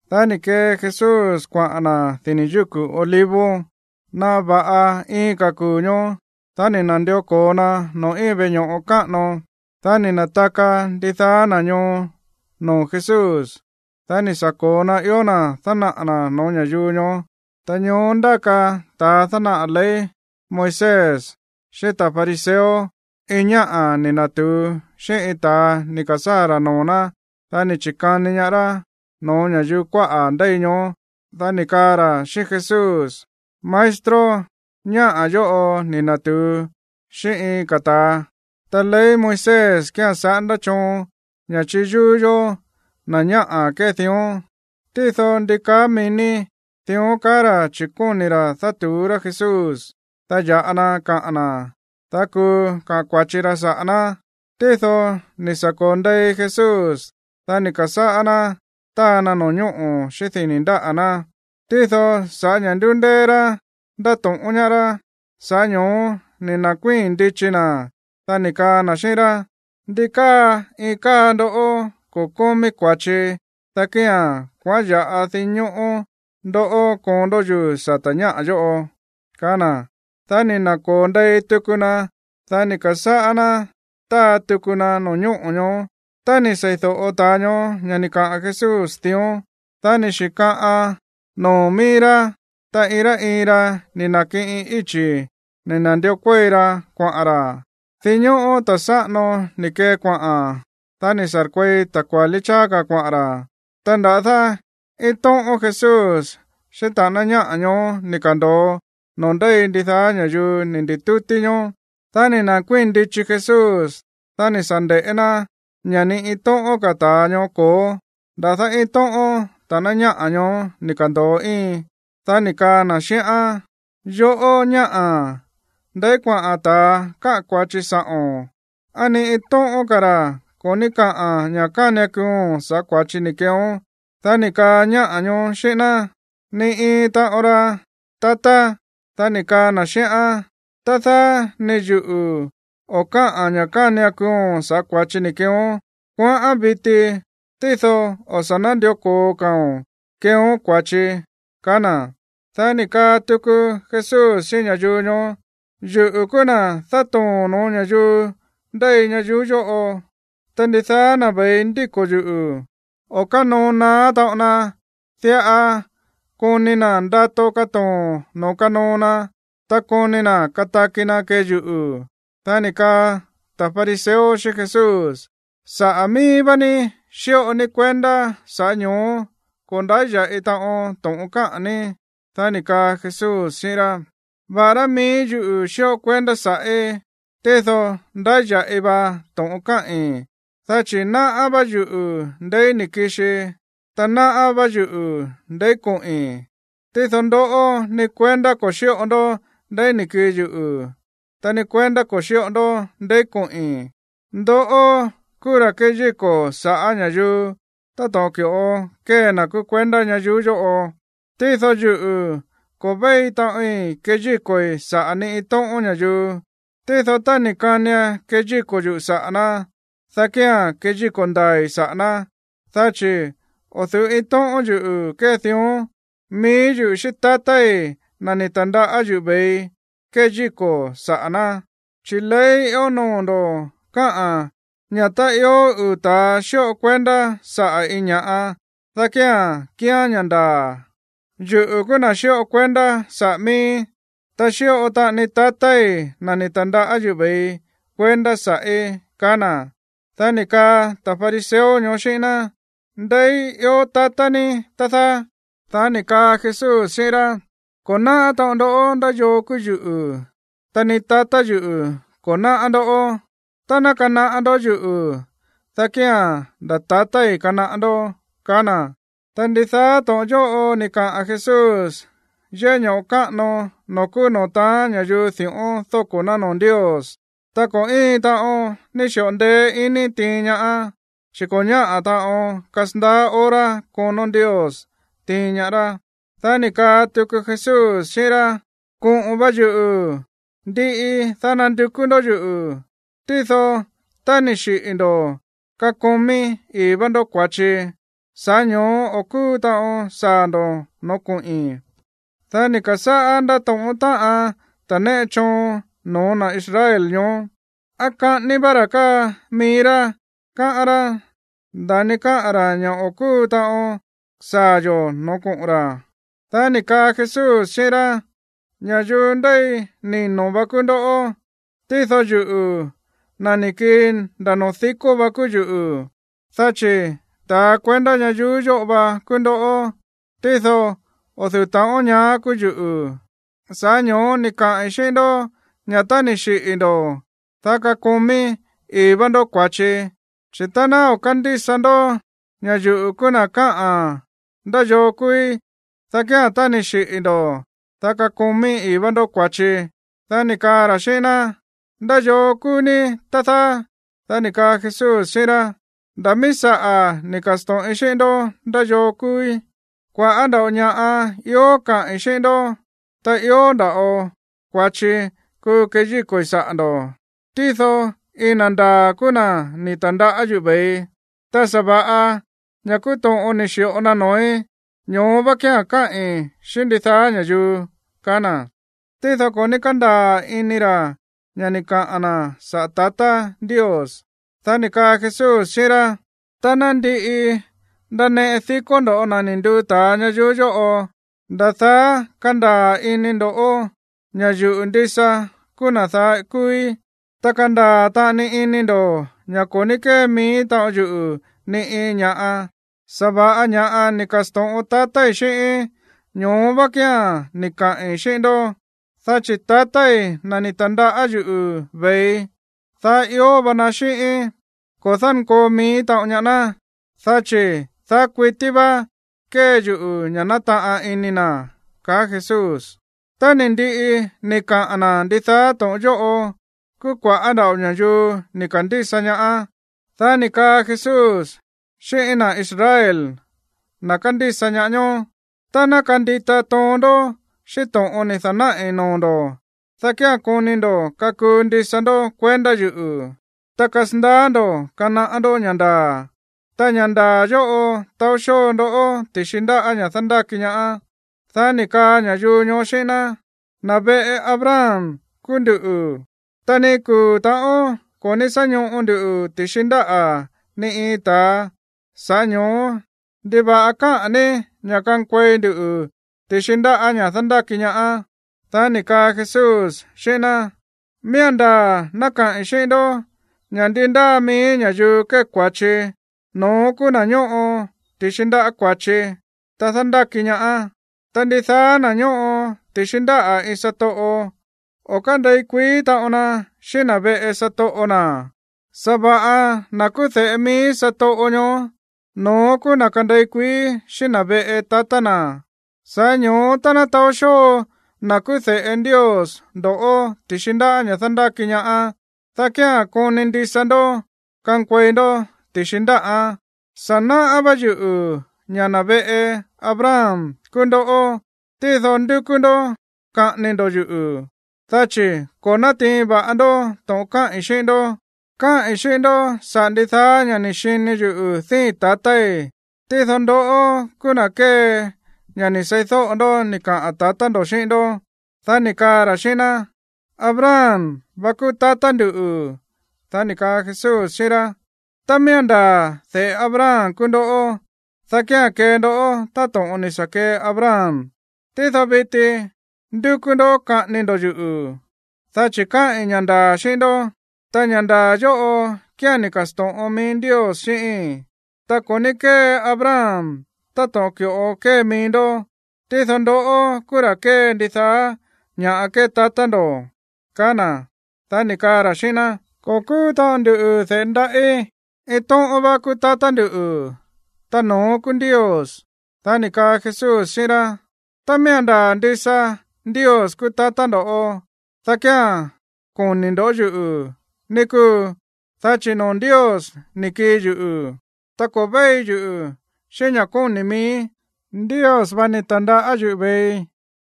Dá ni̱ kee Jesús kuaꞌa̱n na̱ dini̱ yúku̱ Olivos. Ta naꞌa va̱ꞌa iin ka̱ kuu̱ ñoó, dá ni̱ na̱ndió ko̱o na noo̱ íin veꞌe ño̱ꞌo káꞌano. Dá ni̱ na̱taka ndidaá na̱ ñoo noo̱ Jesús. Dá ni̱ sa̱ ko̱o na ió na̱ dánaꞌa̱ na̱ no̱ó ña̱yuu ñoó. Ta ñoó ndáka ta̱ dánaꞌa̱ ley Moisés xíꞌín ta̱ fariseo iin ñáꞌa̱ ni̱ na̱tu̱u xíꞌín iin ta̱a ni̱ ka̱sáa̱ ra̱ noo̱ ná. Dá ni̱ chi̱kani ñaá rá no̱ó ña̱yuu kuáꞌa̱ ndéi ñoó. Dá ni̱ kaa ra̱ xíꞌín Jesús: ―Maestro, ñáꞌa̱ yóꞌo ni̱ na̱tu̱u xíꞌín iin ka̱ ta̱a. Ta ley Moisés kía̱n saꞌándá choon ña̱ chíyúú yó na̱ ñáꞌa̱ kée dión. Tído, ¿ndi kaá mií ní? Dión kaá ra̱ chi̱ kóni̱ ra̱ dátu̱ú rá Jesús, dá ya̱ꞌa na kaꞌa̱n na̱, dá kuu kaꞌa̱n kua̱chi ra saꞌa̱ ná. Tído ni̱ sa̱ ko̱o ndei Jesús, dá ni̱ ka̱sáꞌá ná táa na no̱ñóꞌo̱ xíꞌín dini̱ ndáꞌa̱ ná. Tído sa̱ꞌá ña̱ ndúndéé rá ndáto̱ꞌón ñaá rá, sa̱ꞌá ño̱ó ni̱ na̱kuíi̱n ndichi na̱, dá ni̱ kaa na̱ xíꞌín rá: ―Ndi káa iin káa ndoꞌó ko̱ kómí kua̱chi, dá kía̱n kuaꞌán ya̱ꞌa dinñóꞌó ndó koon ndó yuu̱ sata̱ ñáꞌa̱ yóꞌo ―kaá na̱. Dá ni̱ na̱ko̱o ndei tuku na, dá ni̱ ka̱sáꞌá ná táa tuku na no̱ñóꞌo̱ ñoó. Tá ni̱ seídóꞌo ta̱a ñoó ña̱ ni̱ kaꞌa̱n Jesús dión, dá ni̱ xi̱kaꞌan noo̱ mií rá, ta iin rá iin ra ni̱ na̱kiꞌin íchi̱ ni̱ na̱ndió kuéi ra kuaꞌa̱n ra̱. Dinñóꞌó ta̱ sáꞌano ni̱ kee kuaꞌa̱n, dá ni̱ sa̱rkuei ta̱ kuálí cháá ka̱ kuaꞌa̱n ra̱. Ta nda̱dá iin tóꞌón Jesús xíꞌín ta̱ꞌáná ñáꞌa̱ ñoó ni̱ ka̱ndo̱o noo̱ ndéi ndidaá ña̱yuu ni̱ ndi̱tútí ñoó. Dá ni̱ na̱kuíi̱n ndichi Jesús. Dá ni̱ sa̱ nde̱ꞌé ná ña̱ ni iin tóꞌón ka̱ ta̱a ñoó ko̱ó. Nda̱dá iin tóꞌón ta̱ꞌáná ñáꞌa̱ ñoó ni̱ ka̱ndo̱o íin. Dá ni̱ kaa na̱ xíꞌán: ―Yoꞌó, ñáꞌa̱, ¿ndeí kuaꞌa̱n ta̱a káꞌa̱n kua̱chi sa̱ꞌo̱n? ¿Á ni iin tóꞌón ka̱ ra̱ ko̱ ní káꞌa̱n ña̱ kánian kuuo̱n sa̱ꞌá kua̱chi ni̱ keeón? Dá ni̱ kaa ñáꞌa̱ ñoó xíꞌín ná: ―Ni iin taꞌon ra, tatá. Dá ni̱ kaa na̱ xíꞌán: ―Tá dáá, ni yuꞌu̱ o̱ káꞌa̱n ña̱ kánian kuuo̱n sa̱ꞌá kua̱chi ni̱ keeón. Kuaꞌán viti, tído o̱ sá nándió ko̱o ka̱o̱n keeón kua̱chi ―kaá na̱. Dá ni̱ kaa tuku Jesús xíꞌín ña̱yuu ñoó: ―Yuꞌu̱ kúú na̱ dátoo̱n no̱ó ña̱yuu ndéi ñayuú yóꞌo. Ta ndidaá na̱ ve̱i ndíko̱ yuꞌu̱, o̱ kánoo naá taꞌon na. Diꞌa koni na̱ ndato katoo̱n noo̱ kanoo na, ta koni na̱ kataki na̱ kee yuꞌu̱. Dá ni̱ kaa ta̱ fariseo xíꞌín Jesús: ―Saꞌa̱ mií vá ní xíꞌo ní kuendá, sa̱ꞌá ño̱ó ko̱ ndáya̱ꞌi taꞌon to̱ꞌon káꞌa̱n ní. Dá ni̱ kaa Jesús xíꞌín rá: ―Va̱ꞌará mií yuꞌu̱ xíꞌo kuendá sa̱ꞌí, tído ndáya̱ꞌi va to̱ꞌon káꞌi̱n, dá chi̱ náꞌá vá yuꞌu̱ ndeí ni̱ kixii, ta náꞌá vá yuꞌu̱ ndeí koꞌi̱n. Tído ndoꞌó, ni kuendá ko̱ xíꞌo ndó ndeí ni̱ kii yuꞌu̱, ta ni kuendá ko̱ xíꞌo ndó ndeí koꞌi̱n. Ndoꞌó kúú ra̱ kéyíko̱ saꞌa̱ ña̱yuu táto̱ꞌon ki̱ꞌo kée na̱ kúú kuendá ñayuú yóꞌo. Tído yuꞌu̱, ko̱ véi taꞌoin keyíko̱i̱ saꞌa̱ ni iin tóꞌón ña̱yuu. Tído tá ni̱ kanian keyíko̱ yuꞌu̱ saꞌa̱ ná, dá kía̱n keyíko̱ ndaa̱i̱ saꞌa̱ ná, dá chi̱ o̱ du̱ú iin tóꞌón yuꞌu̱ kee dión. Mií yuꞌu̱ xíꞌín tatái̱, na̱ ni̱ ta̱ndaꞌá yuꞌu̱ ve̱ii, keyíko̱ saꞌa̱ ná. Chi̱ ley ió noo̱ ndo̱ káꞌa̱n ña̱ tá ió uu̱ ta̱a xíꞌo kuendá saꞌa̱ iin ña̱ꞌa, dá kía̱n kíán ña̱ ndaa̱. Yuꞌu̱ kúú na̱ xíꞌo kuendá saꞌa̱ miíí, ta xíꞌo taꞌani tatái̱, na̱ ni̱ ta̱ndaꞌá yuꞌu̱ ve̱ii, kuendá sa̱ꞌí ―kaá na̱. Dá ni̱ kaa ta̱ fariseo ñoó xíꞌín ná: ―¿Ndeí ió tatá ní, tá dáá? Dá ni̱ kaa Jesús xíꞌín rá: ―Ko̱ náꞌá taꞌon ndó ndá yoo kúú yuꞌu̱, ta ni tatá yuꞌu̱ ko̱ náꞌá ndó. Tá ná kanaꞌá ndó yuꞌu̱, dá kía̱n nda̱ tatái̱ kanaꞌá ndó ―kaá na̱. Ta ndidaá to̱ꞌon yóꞌo ni̱ kaꞌa̱n Jesús yéꞌé ño̱ꞌo káꞌano noo̱ kúú noo̱ taán ña̱yuu di̱ꞌón dóko̱ ná noo̱ Ndios. Ta ko̱ íin taꞌon ni̱ xi̱ꞌo ndeé iní tiin ñaá, chi̱ ko̱ ñáꞌa̱ taꞌon kasandaá hora konó Ndios tiin ñaá rá. Dá ni̱ kaa tuku Jesús xíꞌín rá: ―Koꞌo̱n va yuꞌu̱, ndiꞌi, dá nandukú ndó yuꞌu̱, tído tá ni̱ xiꞌi̱ ndo̱, kakomí ii̱ va ndó kua̱chi, sa̱ꞌá ño̱ó o̱ kúu taꞌon saa̱ ndo̱ noo̱ koꞌi̱n. Dá ni̱ ka̱sáꞌá ndátóꞌón táꞌan ta̱ néꞌe choon no̱ó na̱ Israel ñoó: ―¿Á kaꞌání vá ra̱ káa mií rá, káꞌán rá, nda̱ni káꞌa̱n ra̱ ña̱ o̱ kúu taꞌon saa̱ yo̱ no̱ó koꞌo̱n ra̱? Dá ni̱ kaa Jesús xíꞌín rá: ―Ña̱yuu ndéi nino̱ va kúú ndoꞌó, tído yuꞌu̱, na̱ ni̱ kii nda̱ noo̱ dikó vá kúú yuꞌu̱. Dá chi̱ ta̱a kuendá ñayuú yóꞌo va kúú ndoꞌó, tído o̱ du̱ú taꞌon ñaá kúú yuꞌu̱. Sa̱ꞌá ño̱ó ni̱ kaai̱ xíꞌín ndó ña̱ tá ni̱ xiꞌi̱ ndo̱, dá kakomí ii̱ va ndó kua̱chi, chi̱ tá ná o̱ kándísa ndó ña̱ yuꞌu̱ kúú na̱ káꞌa̱n ndá yoo kúúí, dá kía̱n tá ni̱ xiꞌi̱ ndo̱, dá kakomí ii̱ va ndó kua̱chi. Dá ni̱ kaa ra̱ xíꞌín ná: ―¿Ndá yoo kúú ní, tá dáá? Dá ni̱ kaa Jesús xíꞌín rá: ―Nda̱ mií saꞌa̱ ni̱ ka̱sto̱ꞌin xíꞌín ndó ndá yoo kúúí. Kua̱ꞌá nda̱ꞌo ña̱ꞌa ió kaꞌi̱n xíꞌín ndó, ta ió nda̱ꞌo kua̱chi kuu keyíko̱i̱ saꞌa̱ ndo̱. Tído iin na̱ ndaa̱ kúú na̱ ni̱ ta̱ndaꞌá yuꞌu̱ ve̱ii. Ta sa̱va̱ꞌa ña̱ kúú to̱ꞌon ni̱ xi̱ꞌo na noo̱í, ñoó vá kía̱n káꞌi̱n xíꞌín ndidaá ña̱yuu ―kaá na̱. Tído ko̱ ní kándaa̱ ini ra̱ ña̱ ni̱ kaꞌa̱n na̱ saꞌa̱ tatá Ndios. Dá ni̱ kaa Jesús xíꞌín rá: ―Tá ná ndiꞌi ndaneꞌe dikó ndo̱ na̱ ni̱ nduu ta̱a ñayuú yóꞌo, nda̱ daá kandaa̱ ini ndo̱ ña̱ yuꞌu̱ ndisa kúú na̱ daá kúúí. Ta kandaa̱ taꞌani ini ndo̱ ña̱ ko̱ ní kée mií taꞌon yuꞌu̱ ni iin ña̱ꞌa, sa̱va̱ꞌa ña̱ ni̱ ka̱sto̱ꞌon tatái̱ xíꞌíín, ñoó vá kía̱n ni̱ kaꞌi̱n xíꞌín ndó. Dá chi̱ tatái̱, na̱ ni̱ ta̱ndaꞌá yuꞌu̱ ve̱ii, daá ió va na xíꞌíín, ko̱ dánkoo mií taꞌon ñaá ná, dá chi̱ daá kuití vá kée yuꞌu̱ ña̱ nátaꞌan ini na̱ ―kaá Jesús. Tá ni̱ ndiꞌi ni̱ kaꞌa̱n na̱ ndidaá to̱ꞌon yóꞌo, kúú kua̱ꞌá nda̱ꞌo ña̱yuu ni̱ ka̱ndísa ñaá. Dá ni̱ kaa Jesús xíꞌín na̱ Israel, na̱ kándísa ñaá ñoó: ―Tá ná kandita toon ndó xíꞌín to̱ꞌon ni̱ da̱náꞌi̱ noo̱ ndo̱, dá kía̱n koni ndo̱ kakuu ndisa ndó kuendá yuꞌu̱, ta kasandaá ndo̱ kanaꞌá ndó ña̱ ndaa̱. Ta ña̱ ndaa̱ yóꞌo taó xóo ndoꞌó ti̱xi ndáꞌa̱ ña̱ dándáki ñaá. Dá ni̱ kaa ña̱yuu ñoó xíꞌín ná: ―Na̱ veꞌe Abraham kúú nduꞌu̱, ta ni iin kuu̱ ta̱ꞌón ko̱ ní sá ñoꞌo ndu ti̱xi ndáꞌa̱ ni iin ta̱a. Sa̱ꞌá ño̱ó, ¿ndiva̱ꞌa káꞌa̱n ní ña̱ kankuei ndu ti̱xi ndáꞌa̱ ña̱ dándáki ñaá? Dá ni̱ kaa Jesús xíꞌín ná: ―Miía̱n ndaa̱ ná kaꞌi̱n xíꞌín ndó ña̱ ndi ndáa mií ña̱yuu kée kua̱chi, no̱ón kúú na̱ ñóꞌo ti̱xi ndáꞌa̱ kua̱chi, ta dándáki ñaá. Ta ndidaá na̱ ñóꞌo ti̱xi ndáꞌa̱ iin satoꞌo, o̱ kándei kuií taꞌon na xíꞌín na̱ veꞌe satoꞌo na̱. Sa̱va̱ꞌa na̱ kúú de̱ꞌe mií satoꞌo ñoó, no̱ón kúú na̱ kandei kuií xíꞌín na̱ veꞌe tatá na̱. Sa̱ꞌá ño̱ó tá ná taó xóo na̱ kúú de̱ꞌe Ndios ndoꞌó ti̱xi ndáꞌa̱ ña̱ dándáki ñaá, dá kía̱n koni ndisa ndó kankuei ndó ti̱xi ndáꞌán. Sa̱ náꞌá vá yuꞌu̱ ña̱ na̱ veꞌe Abraham kúú ndoꞌó. Tído ndúkú ndó kaꞌání ndó yuꞌu̱, dá chi̱ ko̱ nátiin va̱ꞌa ndó to̱ꞌon káꞌi̱n xíꞌín ndó. Káꞌi̱n xíꞌín ndó saꞌa̱ ndidaá ña̱ ni̱ xini yuꞌu̱ díi̱n tatái̱. Tído ndoꞌó kúú na̱ kée ña̱ ni̱ seídóꞌo ndó ni̱ kaꞌa̱n tatá ndo̱ xíꞌín ndó. Dá ni̱ kaa ra̱ xíꞌín ná: ―Abraham va kúú tatá ndu̱. Dá ni̱ kaa Jesús xíꞌín rá: ―Tá miía̱n ndaa̱ de̱ꞌe Abraham kúú ndoꞌó, dá kía̱n kee ndó táto̱ꞌon ni̱ sa̱ kee Abraham. Tído viti ndúkú ndó kaꞌání ndó yuꞌu̱, dá chi̱ káꞌi̱n ña̱ ndaa̱ xíꞌín ndó, ta ña̱ ndaa̱ yóꞌo kía̱n ni̱ ka̱sto̱ꞌon mií Ndios xíꞌíi̱n. Ta ko̱ ní kée Abraham táto̱ꞌon ki̱ꞌo kée mií ndó. Tído ndoꞌó kúú ra̱ kée ndidaá ña̱ kée tatá ndo̱ ―kaá na̱. Dá ni̱ kaa ra̱ xíꞌín ná: ―Ko̱ kúú taꞌon ndu de̱ꞌe ndaꞌí. Iin tóꞌón vá kúú tatá ndu̱, ta no̱ón kúú Ndios. Dá ni̱ kaa Jesús xíꞌín rá: ―Tá miía̱n ndaa̱ ndisa Ndios kúú tatá ndo̱, dá kía̱n koni̱ ndo̱ yuꞌu̱, ní kúu. Dá chi̱ noo̱ Ndios ni̱ kii yuꞌu̱. Ta ko̱ véi yuꞌu̱ xíꞌín ña̱ kóni̱ miíí, Ndios vá ni̱ ta̱ndaꞌá yuꞌu̱ ve̱ii.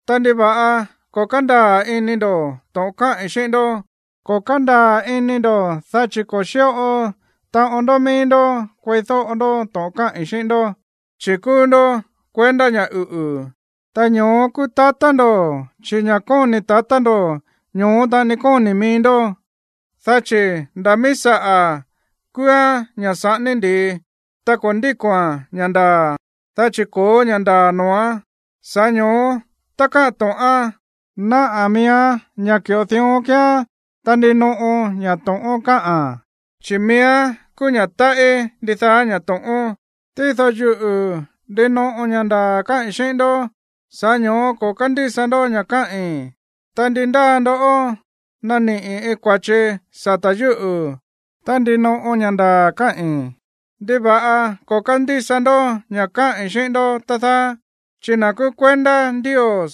Ta, ¿ndiva̱ꞌa ko̱ kándaa̱ ini ndo̱ to̱ꞌon káꞌi̱n xíꞌín ndó? Ko̱ kándaa̱ ini ndo̱, dá chi̱ ko̱ xíꞌo taꞌon ndó mií ndó kueídóꞌo ndó to̱ꞌon káꞌi̱n xíꞌín ndó. Chi̱ kúú ndó kuendá ña̱ uꞌu̱, ta ño̱ó kúú tatá ndo̱, chi̱ ña̱ kóni̱ tatá ndo̱, ño̱ó taꞌani kóni̱ mií ndó. Dá chi̱ nda̱ mií saꞌa̱ kúúán ña̱ saꞌání ndi̱i. Ta ko̱ ndíko̱a̱n ña̱ ndaa̱, dá chi̱ ko̱ó ña̱ ndaa̱ noo̱án. Sa̱ꞌá ño̱ó tá kaꞌa̱n to̱ꞌán, náꞌa̱ miíán ña̱ ki̱ꞌo dión kíán. Ta ndinoꞌo ña̱ to̱ꞌón káꞌa̱n, chi̱ miíán kúú ña̱ táꞌí ndidaá ña̱ to̱ꞌón. Tído yuꞌu̱, ndinoꞌo ña̱ ndaa̱ káꞌi̱n xíꞌín ndó, sa̱ꞌá ño̱ó ko̱ kándísa ndó ña̱ káꞌi̱n. Ta, ¿ndi ndáa ndoꞌó naniꞌi̱ iin kua̱chi sata̱ yúꞌu̱? Tá ndinoꞌo ña̱ ndaa̱ káꞌi̱n, ¿ndiva̱ꞌa ko̱ kándísa ndó ña̱ káꞌi̱n xíꞌín ndó, tá dáá? Chi̱ na̱ kúú kuendá Ndios,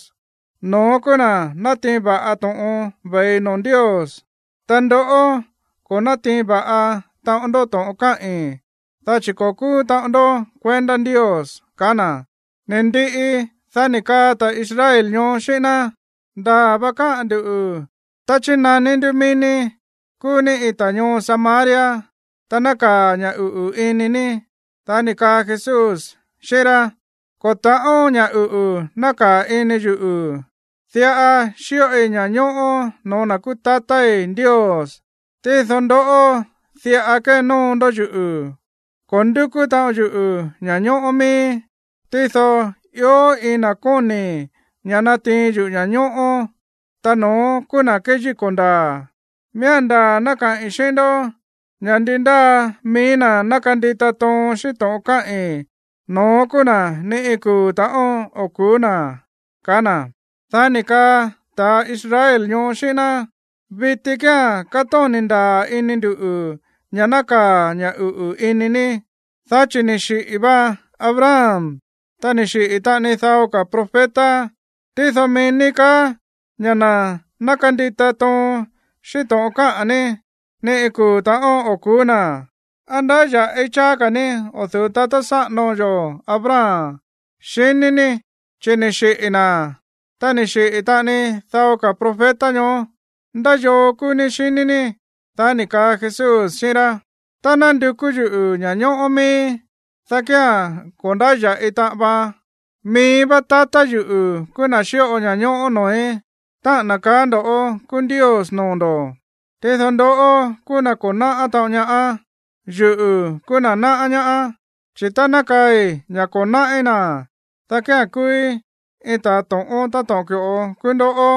no̱ón kúú na̱ natiin va̱ꞌa to̱ꞌon ve̱i noo̱ Ndios. Ta ndoꞌó, ko̱ nátiin va̱ꞌa taꞌon ndó to̱ꞌon káꞌi̱n, dá chi̱ ko̱ kúú taꞌon ndó kuendá Ndios ―kaá na̱. Ni̱ ndiꞌi, dá ni̱ kaa ta̱ Israel ñoó xíꞌín ná: ―Ndaa̱ va káꞌa̱n ndu̱ tá chínaní ndú mií ní kúú ní iin ta̱ ñoo Samaria, ta nákaa̱ ña̱ uꞌu̱ ini ní. Dá ni̱ kaa Jesús xíꞌín rá: ―Ko̱ ta̱ꞌón ña̱ uꞌu̱ nákaa̱ ini yuꞌu̱. Diꞌa xíꞌoi ña̱ñóꞌó no̱ó na̱ kúú tatái̱ Ndios. Tído ndoꞌó, diꞌa kénóo ndó yuꞌu̱. Ko̱ ndúkú taꞌon yuꞌu̱ ña̱ñóꞌó miíí. Tído ió iin na̱ kóni̱ ña̱ natiin yuꞌu̱ ña̱ñóꞌó, ta no̱ón kúú na̱ kéyíko̱ ndaa̱. Miía̱n ndaa̱ ná kaꞌi̱n xíꞌín ndó ña̱ ndi ndáa mií na̱ ná kandita toon xíꞌín to̱ꞌon káꞌi̱n, no̱ón kúú na̱ ni kuu̱ ta̱ꞌón o̱ ku̱ú na̱ ―kaá na̱. Dá ni̱ kaa ta̱ Israel ñoó xíꞌín ná: ―Viti kía̱n kátóni̱ ndaa̱ ini ndu̱ ña̱ nákaa̱ ña̱ uꞌu̱ ini ní, dá chi̱ ni̱ xiꞌi̱ va Abraham, ta ni̱ xiꞌi̱ taꞌani dao ka̱ profeta. Tído mií ní kaá ña̱ na̱ ná kandita toon xíꞌín to̱ꞌon káꞌa̱n ní, ni iin kuu̱ ta̱ꞌón o̱ ku̱ú na̱. ¿Á ndáya̱ꞌi cháá ka̱ ní o̱ du̱ú tatá sáꞌano yo̱ Abraham, xiní ní? Chi̱ ni̱ xiꞌi̱ na̱, ta ni̱ xiꞌi̱ taꞌani dao ka̱ profeta ñoó. ¿Ndá yoo kúú ní, xiní ní? Dá ni̱ kaa Jesús xíꞌín rá: ―Tá ná ndukú yuꞌu̱ ña̱ñóꞌó miíí, dá kía̱n ko̱ ndáya̱ꞌi taꞌan vaan. Mií vá tatá yuꞌu̱ kúú na̱ xíꞌo ña̱ñóꞌó noo̱í, táꞌa̱n na̱ kaá ndo̱ kúú Ndios noo̱ ndo̱. Tído ndoꞌó kúú na̱ ko̱ náꞌá taꞌon ñaá. Yuꞌu̱ kúú na̱ náꞌá ñaá. Chi̱ tá ná kaai̱ ña̱ ko̱ náꞌí na̱, dá kía̱n kúúí iin ta̱ to̱ꞌón táto̱ꞌon ki̱ꞌo kúú ndoꞌó.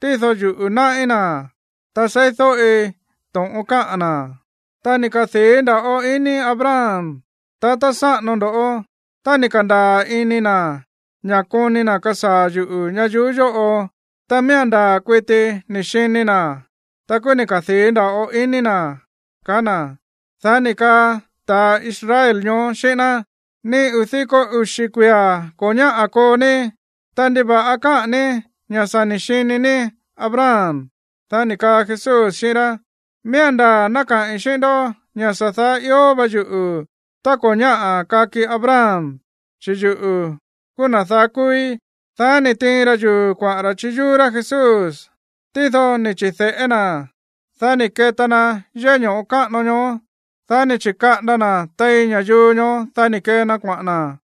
Tído yuꞌu̱ náꞌí na̱, ta seídóꞌi to̱ꞌon káꞌa̱n na̱. Ta ni̱ kadii̱ nda̱ꞌo ini Abraham, tatá sáꞌano ndó, tá ni̱ ka̱ndaa̱ ini na̱ ña̱ koni na̱ kasaa̱ yuꞌu̱ ñayuú yóꞌo. Ta miía̱n ndaa̱ kuiti ni̱ xini na̱án, ta kúú ni̱ kadii̱ nda̱ꞌo ini na̱ ―kaá na̱. Dá ni̱ kaa ta̱ Israel ñoó xíꞌín ná: ―Ni uu̱ diko uxi̱ kuia̱ ko̱ ñáꞌa̱ koo ní, ta, ¿ndiva̱ꞌa káꞌa̱n ní ña̱ sa̱ ni̱ xini ní Abraham? Dá ni̱ kaa Jesús xíꞌín rá: ―Miía̱n ndaa̱ ná kaꞌi̱n xíꞌín ndó ña̱ sa̱ daá ió va yuꞌu̱ tá ko̱ ñáꞌa̱ kaki Abraham, chi̱ yuꞌu̱ kúú na̱ daá kúúí. Dá ni̱ tiin ra yuu̱ kuaꞌa̱n ra̱ chiyúú rá Jesús. Tído ni̱ chi̱de̱ꞌé na̱, dá ni̱ keta na yéꞌé ño̱ꞌo káꞌano ñoó. Dá ni̱ chi̱kaꞌanda na̱ tein ña̱yuu ñoó, dá ni̱ kee na kuaꞌa̱n na̱.